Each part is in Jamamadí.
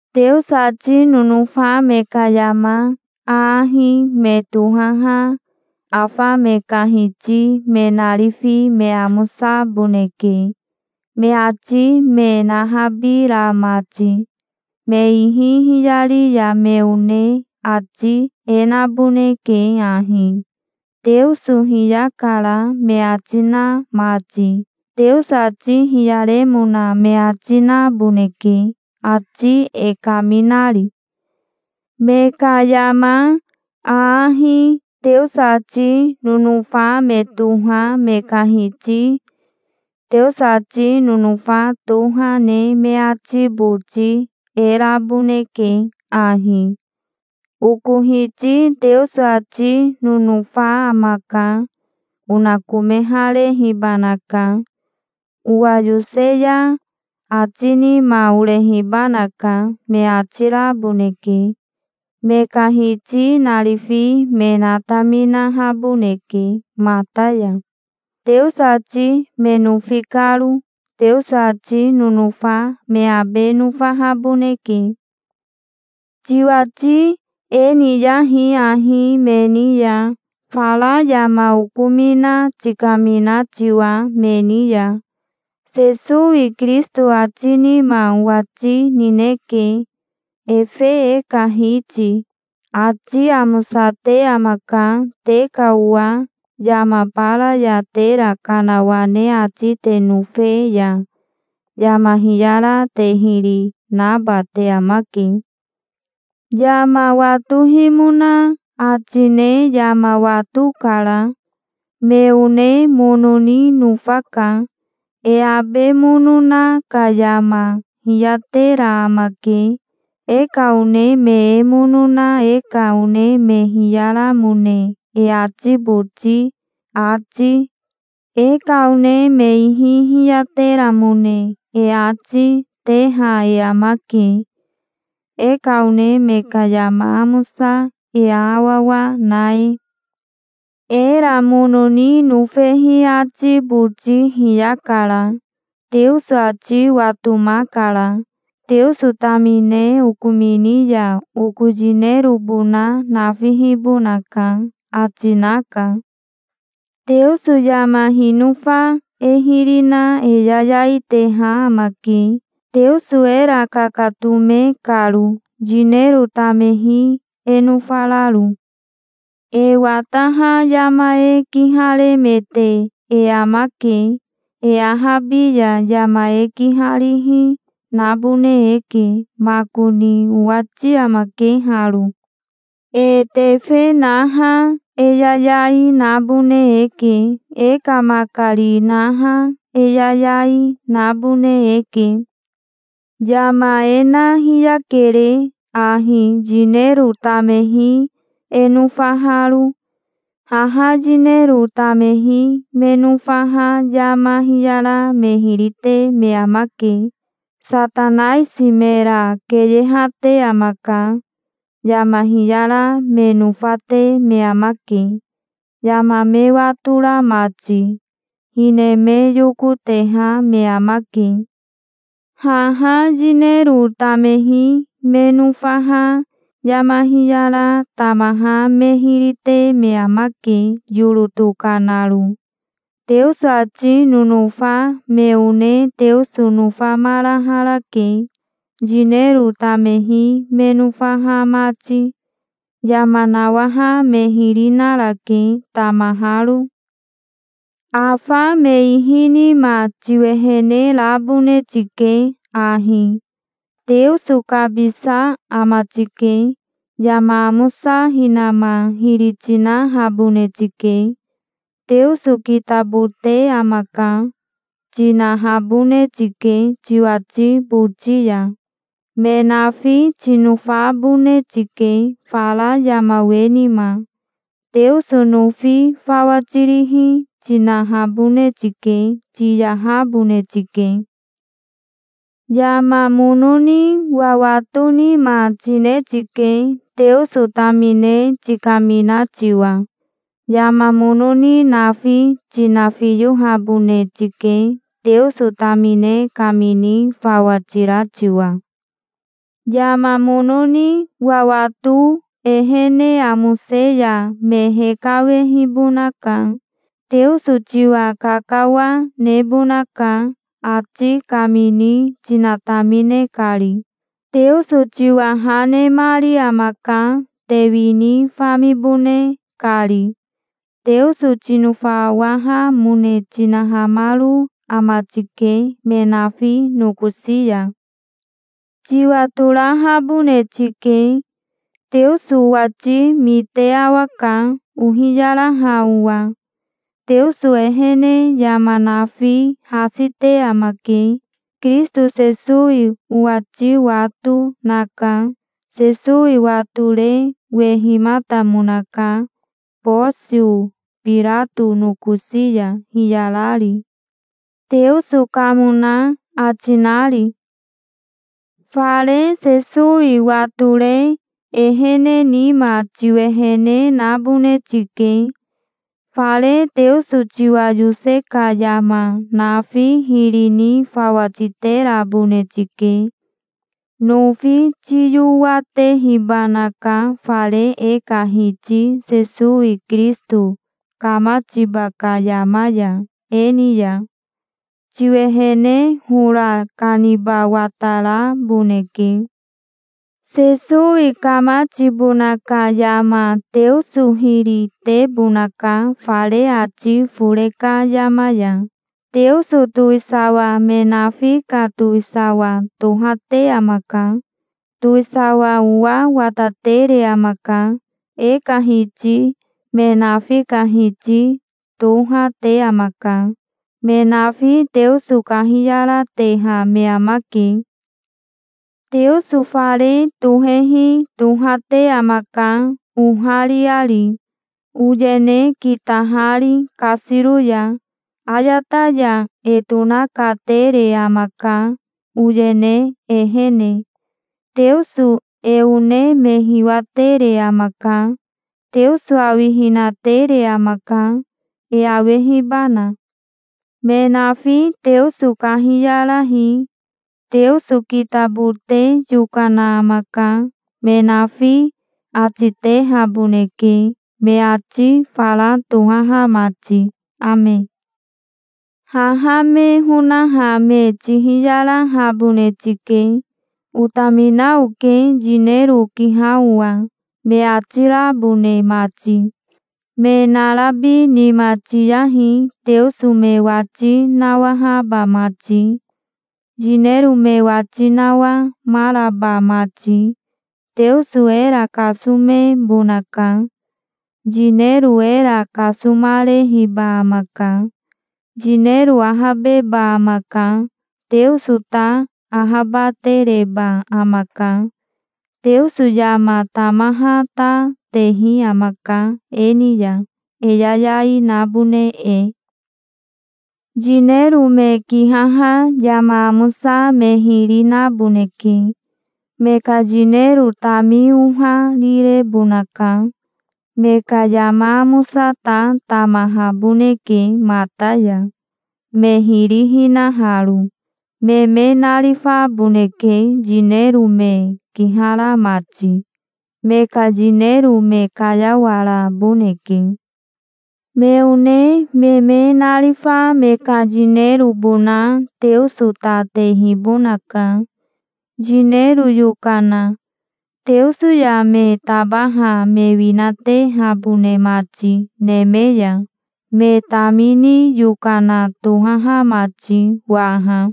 Teoso ati nonofa me ka yama aahi me tohaha afa me ka hiti me narifi me amosaboneke, me ati me nahabira mati. Me ihi hiyari ya me one ati e naboneke ahi: "Teoso hiyakara", me ati na mati. Teoso ati hiyaremona me ati, naboneke, ati e kaminari. Me ka yama aahi Teoso ati nonofa me toha me ka hiti Teoso ati nonofa toha ne me ati boti e raboneke ahi: "Oko hiti Teoso ati nonofa amaka. Onakomeharehibanaka. Owa yose ya ati nima orehibanaka", me ati raboneke. Me ka hiti narifi me nataminahaboneke mata ya, Teoso ati me nofi karo. Teoso ati nonofa me abe nofahaboneke. Tiwati e niyahi ahi me ni ya, fara yama okomina tikamina tiwa, me ni ya. Sesowi Kirisito ati nima owati nineke, efe e ka Hiti. Ati amosate amaka. Te ka owa yama bara ya tera kanawane ati te nofe ya yama hiyara te hiri naba te amake. Yama watohimona ati ne yama watokara. Me one mono ni nofaka. E abe mono na ka yama hiyatera amake. E ka one me e mono na e ka one me hiyaramone e ati boti ati, e ka one me ihi hiyateramone e ati, teha e amake, e ka one me ka yama amosa e aawawa na e. Era mono ni nofehi ati boti hiyakara. Teoso ati watomakara. "Teoso tamine okomini ya oko yinerobona nafihibonaka", ati naka. Teoso yama hinofa e hiri na e yayai teha amake, Teoso era kakatome karo, yinero tamehi e nofararo. E wataha yama e kiharemete e amake. E ahabi ya yama e kiharihi nabone eke. Makoni owati amake haro. E tefe naha e yayai nabone eke. E ka makari naha e yayai, nabone eke. Yama e na hiyakere ahi yinero tamehi e nofaharo. Haha yinero tamehi me nofaha yama hiyara me hiri te me amake. Satanaisi mera keyehate amaka. Yama hiyara me nofate me amake, yama me watora mati. Hine me yokoteha me amake. Haha yinero tamehi me nofaha yama hiyara tamaha me hiri te me amake, yoro tokanaro. Teoso ati nonofa me one Teoso nofamaraharake, yinero tamehi me nofaha mati. Yama nawaha me hiri narake, tamaharo. Afa me ihi nima tiwehene rabone tike ahi. Teoso kabisa ama tike. Yama amosa hinama hiri tinahabone tike. "Teoso kitabote amaka", tinahabone tike tiwati boti ya. Me nafi tinofabone tike fara yama we nima. Teoso nofi fawa tirihi tinahabone tike. Tiyahabone tike. Yama mono ni wawato nima tine tike, Teoso tamine tikamina tiwa. Yama mono ni nafi tinafiyohabone tike, Teoso tamine kamini fawa tira tiwa. Yama mono ni wawato ehene amose ya me hekawehibonaka. Teoso tiwa kakawa nebonaka, ati kamini tinatamine kari. Teoso tiwa ha nemari amaka, te wini famibone kari. Teoso tinofawahamone tinahamaro ama tike, me nafi nokosi ya. Tiwatorahabone tike. Teoso owati mite awaka ohiyaraha owa. Teoso ehene yama nafi hasi te amake. Kirisito Sesowi owati wato naka. Sesowi watore wehimatamonaka Bosio Birato nokosi ya hiyarari, Teoso kamona ati nari. Fare Sesowi watore ehene nima tiwehene nabone tike. Fare Teoso tiwa yose ka yama nafi hiri ni fawa titerabone tike. Nofi tiyowatehibanaka fare e ka Hiti Sesowi Kirisito kamatiba ka yama ya e ni ya. Tiwehene hora kaniba wataraboneke. Sesowi kamatibona ka yama Teoso hiri tebonaka fare ati fore ka yama ya. Teoso towisawa me nafi ka towisawa tohate amaka. Towisawa owa watatere amaka. E ka Hiti me nafi ka Hiti toha, te amaka. Me nafi Teoso kahiyarateha me amake. Teoso fare tohehi tohate amaka, ohariari, oyene kitahari kasiro ya. Ayata ya e tonakatere amaka, oyene ehene. Teoso e one me hiwatere amaka. Teoso awihina tere amaka, e awehibana. Me nafi Teoso kahiyarahi. "Teoso kitabote yokana amaka", me nafi ati tehaboneke, me ati fara tohaha mati. Ame. Haha me honaha me tihiyarahabone tike, "Otamina oke, yinero okiha owa", me ati rabone mati. Me narabi nima tiyahi Teoso me wati nawahaba mati, yinero me wati nawamaraba mati. Teoso era kasomebonaka. Yinero era kasomarehiba amaka. Yinero ahabeba amaka. Teoso ta ahabatereba amaka. Teoso yama tamaha ta tehi amaka e ni ya, e yayai nabone e. Yinero me kihaha yama amosa me hiri naboneke. Me ka yinero tami oharirebonaka. Me ka yama amosa ta tamahaboneke mata ya, me hiri hinaharo. Me me narifaboneke, yinero me kihara mati. Me ka yinero me kayawaraboneke. Me one me me narifa me ka yinerobona Teoso ta tehibonaka, yinero yokana, Teoso ya me tabaha me winatehabone mati neme ya, me tamini yokana tohaha mati waha.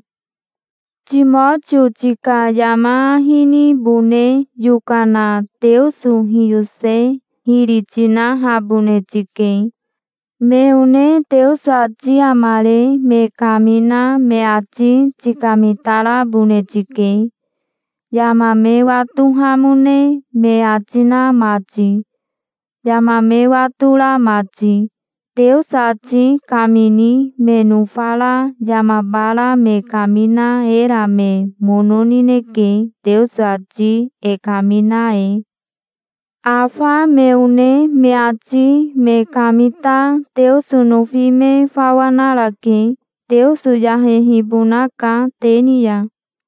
Timotio tika yama ahi nibone yokana Teoso hiyose hiri tinahabone tike. Me one Teoso ati amare me kamina me ati tikamitarabone tike, yama me watohamone me ati na mati, yama me watora mati. Teoso ati kamini me nofara yama bara me kamina era me mono nineke, Teoso ati e kamina e. Afa me one me ati me kamita Teoso nofi me fawa narake. Teoso yahehibonaka te ni ya.